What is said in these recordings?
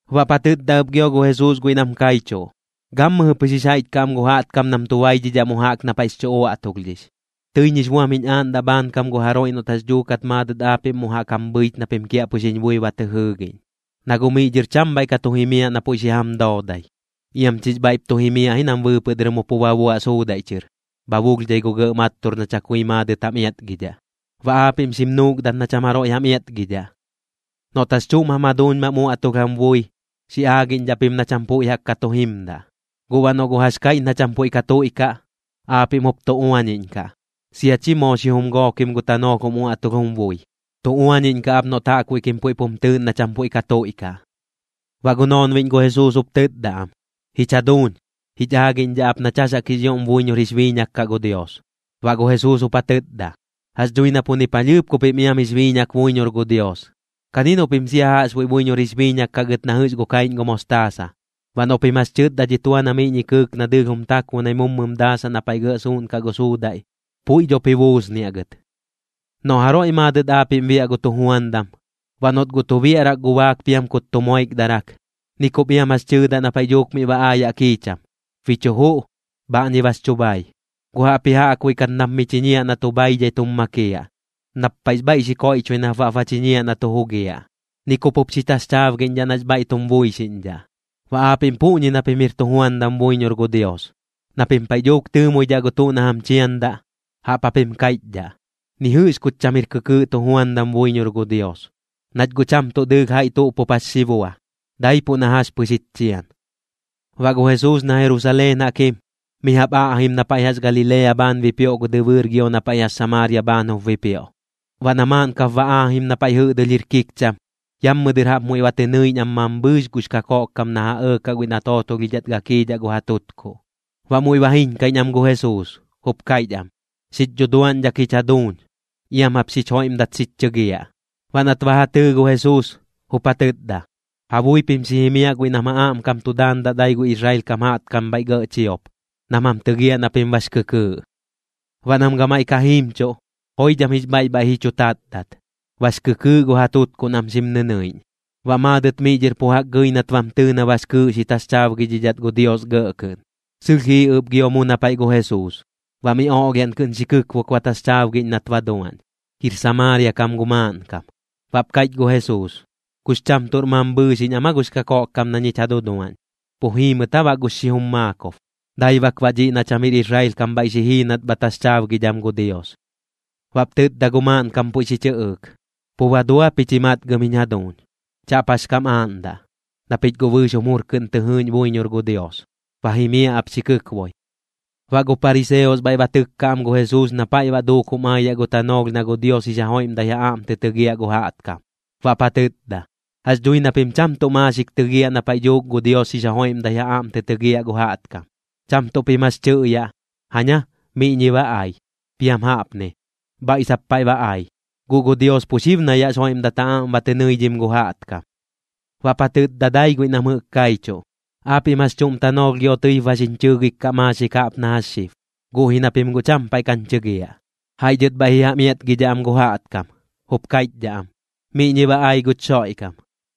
Baꞌp ja tɨtda ɨp gio gu Jesuus guiꞌ nam kaichuꞌ: ―Gammɨjɨ pɨx jix jaiꞌch kaꞌ am gu jaꞌtkam nam tu baidhidhaꞌ mu jaꞌk na paiꞌx chu uaꞌtulhdhix. Tɨiñ jix buam jiñ aaꞌndaꞌ bhaankam gu jaroiꞌ noꞌt jax dhuukat maadɨt aapiꞌm mu jaꞌk jam bhɨich na pim kiaꞌpɨx jiñ bui ba tɨ jɨɨgiꞌñ, na guꞌ miꞌ dhɨr cham bhaiꞌ ka tu jimiaꞌ na puiꞌ xi jam doodai. Iam chix bhaiꞌp tu jimiaꞌ ji nam bɨɨpɨꞌ dɨr mu pu ba buaꞌ suudaiꞌ chɨr, bha bulhdhai gu gɇꞌ mattur na chakui maadɨt jam iatgidhaꞌ. Baꞌ aapiꞌm xim nuukdat na cham jaroiꞌ jam iatgidhaꞌ. ’Noꞌt jax chuꞌm jam jaduuñ mam uaꞌtulh jam bui, xi aagiꞌñdhaꞌ pim na cham puiꞌ jaꞌk tu jimdaꞌ. Guꞌ baꞌ noꞌ guꞌ jax kaiꞌch na cham puiꞌ ka tuiꞌkaꞌ, aapiꞌm jup tu uañiꞌñkaꞌ. Sia chi moo xijum gookim gu tanoolh jum uaꞌtulh jum bui, tu uañiꞌñ kaꞌ ap noꞌt jaꞌkbuiꞌ kim puiꞌp jum tɨɨꞌn na cham puiꞌ ka tuiꞌkaꞌ. Baꞌ gu noonbiꞌñ gu Jesuus jup tɨtda am: ―Jich jaduuñ, jich aagiꞌñdhaꞌ ap nach jax jaꞌk jix ioꞌm buiñor jix biiñak kaꞌ gu Dios. Baꞌ gu Jesuus jup ja tɨtda: ―Jax dhui na pu ni palhɨɨp ku pim iam jix biiñak buiñor gu Dios. Kani noꞌ pim sia jaꞌxbuiꞌ buiñor jix biiñak kaꞌ gɨt na jɨꞌx gu kaiꞌñ gu mostaasa, baꞌ noꞌ pim jax tɨtda dhi tua na miꞌñi kɨɨk na dɨɨlh jum takbunai mummɨm daasaꞌ na paiꞌ gɇꞌ suuꞌn gu suudaiꞌ, puiꞌ dhop ji buusniaꞌ gɨt. ’Noꞌ jaroiꞌ maadɨt aapiꞌm biaꞌ gu tujuandam, baꞌ noꞌt guꞌ tu biaꞌrak gu baak piam kut tu moikdarak, ni kup iam jax tɨɨdaꞌ na paiꞌ dhuuk miꞌ ba aayaꞌ kiicham: “Bi chu juꞌ. Bhaꞌñi bax chu bhai.” Guꞌ jaꞌpji jaꞌkbuiꞌ kat nap mi chiñiaꞌ na tu bhaidhai tum makiaꞌ. Nap paiꞌx bhaiꞌ xi koiꞌchoi nap baꞌp ba chiñiaꞌ na tu jugiaꞌ. Ni kup jup xi taxchaabgiꞌñdhaꞌ nax bhaiꞌ tum buixiꞌñdhaꞌ. Baꞌ aapiꞌm puꞌñi na pim jir tujuandam buiñor gu Dios. Na pim paiꞌ dhuuk tɨɨmoidhaꞌ gu tuꞌ na jam chiandaꞌ, jaꞌp japim kaiꞌchdhaꞌ: “Ni jɨꞌx kuch cham jir kɨkɨɨꞌ tujuandam buiñor gu Dios, nach guꞌ cham tuꞌ dɨɨlh jaiꞌ tuꞌ pup jax xi bua, daipuꞌ na jax pɨx jich chian.” Baꞌ gu Jesuus na Jerusaleen jaꞌk jim, mi jaꞌp aꞌjim na paiꞌ jax Galilea bhaan bipioꞌ gu dɨbɨɨr gio na paiꞌ jax Samaaria bhaan jup bipioꞌ. Baꞌ na maaꞌn kap ba aajim na paiꞌ jɨꞌdɨlh jir kikcham, yammɨ dɨr jaꞌp muiꞌ ba tɨ nɨiꞌñ am mambhɨɨx gux kakoꞌkkam na ja ɇɇkaꞌ guiꞌ na tootolhidhat gakiidhaꞌ gu ja tutkuꞌ. Baꞌ muiꞌ ba jiiñkaiꞌñ am gu Jesuus, jup kaiꞌch am: ―¡Xich dhuduaꞌñdhak jich jaduuñ! ¡Iam jap xich joiꞌmdat xich chɨgiaꞌ! Baꞌ nat ba ja tɨɨ gu Jesuus, jup ja tɨtda: ―Ja bui pim xi jimiaꞌ guiꞌ nam ja aꞌmkam tu daandaꞌ dai gu Israel kam jaꞌtkam bhaiꞌ gɇꞌ chiop, nam jam tɨgiaꞌ na pim bax kɨkɨɨꞌ. Baꞌ nam gamaiꞌ ka jiimchuꞌ, joidham jix bhaiꞌ bhaiꞌ ji chu tatdat, bax kɨkɨɨꞌ gu ja tutkuꞌ nam xim nɨnɨiꞌñ. Baꞌ maadɨt miꞌ dhɨr pu jaꞌk gɨi nat bam tɨɨ na bax kɨɨꞌ xi taxchaabgidhidhat gu Dios gɇꞌ kɨꞌn. Sɨlh jii ɨp gio mu na paiꞌ gu Jesuus, baꞌ miꞌ oꞌlhiaꞌn kɨꞌn xi kɨkbok ba taxchaabgiꞌñ nat ba duaꞌñ. Jir Samaaria kam gu maaꞌnkam. Baꞌp kaiꞌch gu Jesuus: ―¿Kux cham tuꞌr mambhɨɨxiꞌñ am aa gux kakoꞌkkam na ñich ja duduaꞌñ? ¿Pu jii mɨt aa baꞌ gu xijum maakob? Dai bak baꞌ dhiꞌ na cham jir Israel kam bhaiꞌ xi jii nat bha taxchaabgidham gu Dios. Baꞌp tɨtda gu maaꞌnkam puiꞌ xi chɨꞌɨɨk: ―Pu ba dua pich ji matgɨm jiñ jaduuñ, chaꞌp jax kam aaꞌndaꞌ, na pich guꞌ bɨɨx jum jur kɨꞌn tɨ jɨɨꞌñ buiñor gu Dios. Ba jimiaꞌ ap xi kɨkboi. Baꞌ gu pariseos bhaiꞌ ba tɨkkaꞌ am gu Jesuus na paiꞌ baꞌ duuk jum aayaꞌ gu tanoolh na gu Dios jix ja joiꞌmdat ja aꞌm tɨ tɨgiaꞌ gu jaꞌtkam. Baꞌp ja tɨtda: ―Jax dhui na pim cham tuꞌ maaxik tɨgiaꞌ na paiꞌ dhuuk gu Dios jix joiꞌmdat ja aꞌm tɨ tɨgiaꞌ gu jaꞌtkam. Cham tuꞌ pim jax tɨꞌyaꞌ: “Jaña, miꞌñi ba ai.” Piam jaꞌpni: “Bhaiꞌ sap paiꞌ ba ai.” Guꞌ gu Dios pu xib na yaꞌx joiꞌmdat ja aꞌm ba tɨ nɨidhim gu jaꞌtkam. Baꞌp ja tɨtda dai guiꞌ nam jɨꞌk kaichuꞌ: ―Aapiꞌm jax chuꞌm tanoolh gio tɨip ba xiñ chɨɨgik kaꞌ maaxik jaꞌp na jax xib, guꞌ ji na pim guꞌ cham paiꞌ kañ chɨgiaꞌ. Jaiꞌ dhɨt bhaiꞌ ji jam iatgiꞌñdhaꞌ am gu jaꞌtkam, jup kaiꞌchdhaꞌ am: “Miꞌñi ba ai guch Xoiꞌkam.”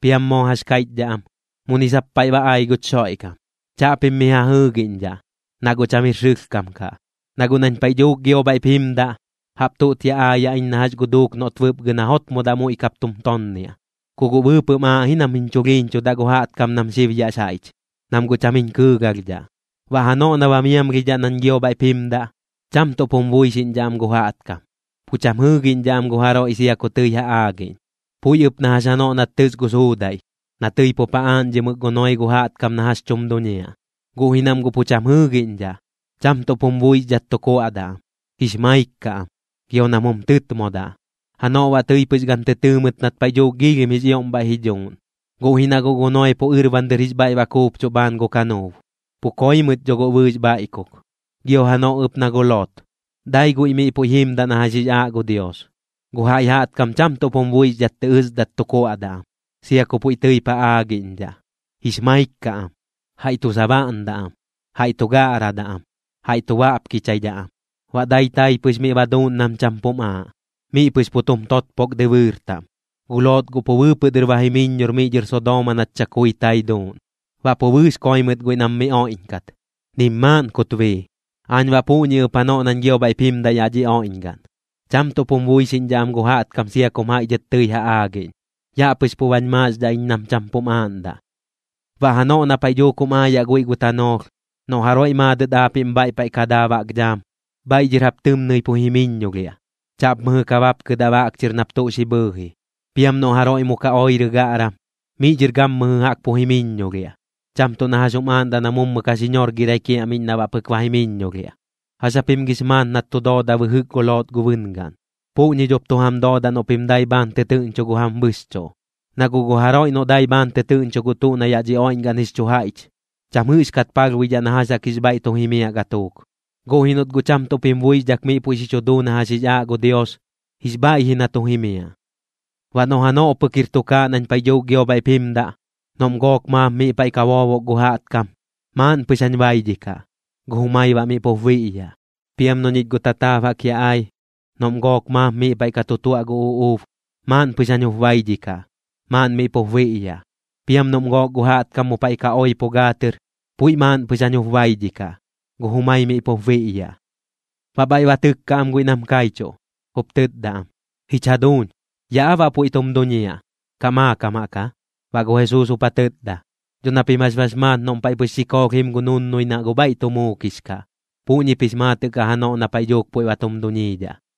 Piam moo jax kaiꞌchdhaꞌ am: “Muni sap paiꞌ ba ai guch Xoiꞌkam.” Chaꞌpim miꞌ ja jɨɨgiꞌñdhaꞌ, na guꞌ cham jir sɨlhkam kaꞌ. Na guꞌ nañ paiꞌ dhuuk gio bhaiꞌp jimdaꞌ, jaꞌp tuꞌt ya aayaꞌ iñ na jax gu duuk noꞌt bɨpgɨ na jotmodaꞌ muiꞌ kap tum tonniaꞌ. Ku guꞌ bɨɨpɨꞌm aaꞌ ji nam jiñ chulhiiñchudaꞌ gu jaꞌtkam nam xib yaꞌx jaiꞌch, nam guꞌ cham jiñ kɨɨgalhdhaꞌ. Baꞌ janoꞌ na ba miamlhidhaꞌ nañ gio bhaiꞌp jimdaꞌ, cham tuꞌp jum buixiꞌñdhaꞌ am gu jaꞌtkam, pu cham jɨɨgiꞌñdhaꞌ am gu jaroiꞌ sia ku tɨi ja aagiꞌñ. Puiꞌ ɨp na jax janoꞌ nat tɨs gu suudaiꞌ, na tɨi pup ja aaꞌñdhimɨk gu Noee gu jaꞌtkam na jax tum duñiaꞌ, guꞌ ji nam guꞌ pu cham jɨɨgiꞌñdhaꞌ. Cham tuꞌp jum buixdhat tu kuaꞌdaꞌ am, jix maik kaꞌ am, gio nam jum tɨtmodaꞌ. Janoꞌ baꞌ tɨi pɨx gan tɨ tɨɨ mɨt nat paiꞌ dhuuk giilhim jix ioꞌm bhaiꞌ ji dhuuꞌn, guꞌ ji na guꞌ gu Noee pu ɨrban dɨr jix bhaiꞌ baꞌ kuupchuꞌ bhaan gu kanuub. Pu koi mɨt dho guꞌ bɨɨx bhaiꞌkuk. Gio janoꞌ ɨp na gu Lot, dai guiꞌ miꞌ puiꞌ jimdaꞌ na jax jix aaꞌ gu Dios. Gu jaiꞌ jaꞌtkam cham tuꞌp jum buixdhat tɨ ɨsdat tu kuaꞌdaꞌ am, sia ku puiꞌ tɨip ja aagiꞌñdhaꞌ. Jix maik kaꞌ am, jaiꞌ tu sabaꞌndaꞌ am, jaiꞌ tu gaꞌradaꞌ am, jaiꞌ tu baꞌpkichaidhaꞌ am. Baꞌ dai tai pɨx miꞌ ba duuꞌn nam cham pum aaꞌ, miꞌ pɨx pu tum totpok dɨbɨɨr taꞌm. Gu Lot guꞌ pu bɨɨpɨꞌ dɨr ba jimiññor miꞌ dhɨr Sodooma nat chakui tai duuꞌn. Baꞌ pu bɨɨx koi mɨt guiꞌ nam mi oiꞌñkat, nim maaꞌn kut bii. Aañ baꞌ puꞌñi ɨp janoꞌ nañ gio bhaiꞌp jimdaꞌ yaꞌ dhi oiꞌñgaꞌn, cham tuꞌp jum buixiꞌñdhaꞌ am gu jaꞌtkam sia kum jaiꞌ dhɨt tɨi ja aagiꞌñ. Yaꞌ pɨx pu bañ maaxdhaꞌ iñ nam cham pum aaꞌndaꞌ. ’Baꞌ janoꞌ na paiꞌ dhuuk jum aayaꞌ guiꞌ gu tanoolh, noꞌ jaroiꞌ maadɨt aapiꞌm bhaiꞌ paiꞌ ka daa baꞌk dhaam, bhaiꞌ dhɨr jap tɨmnɨi pu jimiññolhiaꞌ. Chaꞌp mɨjɨ ka bapkɨdaꞌ baꞌk chɨr nap tuꞌ xi bhɨɨji. Piam noꞌ jaroiꞌ mu ka oirɨ gaꞌram, miꞌ dhir gammɨjɨ jaꞌk pu jimiññolhiaꞌ. Cham tuꞌ na jax jum aaꞌndaꞌ na mummɨ ka xi ñorgɨraꞌ kiaꞌmiꞌñ na baꞌ pɨk ba jimiññolhiaꞌ. Jax japim gix maat nat tu dooda bɨjɨk gu Lot gu bɨngaꞌn, puꞌñi dhop tu jam doodaꞌ noꞌ pim dai bhaan tɨtɨɨꞌñcho gu jam bɨxchuꞌ. Na guꞌ gu jaroiꞌ noꞌ dai bhaan tɨtɨɨꞌñcho gu tuꞌ na yaꞌ dhi oiꞌñgaꞌn jix chu jaiꞌch, cham jɨꞌxkat palhbuidhaꞌ na jax jaꞌk jix bhaiꞌ tu jimiaꞌ gatuuk. Guꞌ ji noꞌt guꞌ cham tuꞌp jim buixdhak miꞌ puiꞌ xi chu duu na jax jix aaꞌ gu Dios, jix bhaiꞌ ji na tu jimiaꞌ. ’Baꞌ noꞌ janoꞌ pɨk jir tukaaꞌ nañ paiꞌ dhuuk gio bhaiꞌp jimdaꞌ, noꞌm gook maap miꞌ paiꞌ ka boobok gu jaꞌtkam, maaꞌn pɨx jañ baidhikaꞌ, gu jumai baꞌ miꞌ pup biꞌyaꞌ. Piam noꞌ ñich guꞌ tataab jaꞌk yaꞌ ai, noꞌm gook maap miꞌ paiꞌ ka tu tuaꞌ gu uꞌuub, maaꞌn pɨx jañ jup baidhikaꞌ, maaꞌn miꞌ pup biꞌyaꞌ. Piam noꞌm gook gu jaꞌtkam mu paiꞌ ka oipo gaa tɨr, puiꞌ maaꞌn pɨx jañ jup baidhikaꞌ, gu jumai miꞌ pup biꞌyaꞌ. Baꞌ bhaiꞌ ba tɨkka am guiꞌ nam kaichuꞌ, jup tɨtda am: ―¿Jich jaduuñ, yaꞌ aa baꞌ puiꞌ tum duñiaꞌ, kaꞌ maakam jaꞌk aa? Baꞌ gu Jesuus jup ja tɨtda: ―Dho na pim jax bax maat noꞌm paiꞌ pɨx xikoolh jiim gu nunnui na guꞌ bhaiꞌ tu muukix kaꞌ, puꞌñip jix maatɨꞌ kaꞌ janoꞌ na paiꞌ dhuuk puiꞌ ba tum duñiidhaꞌ.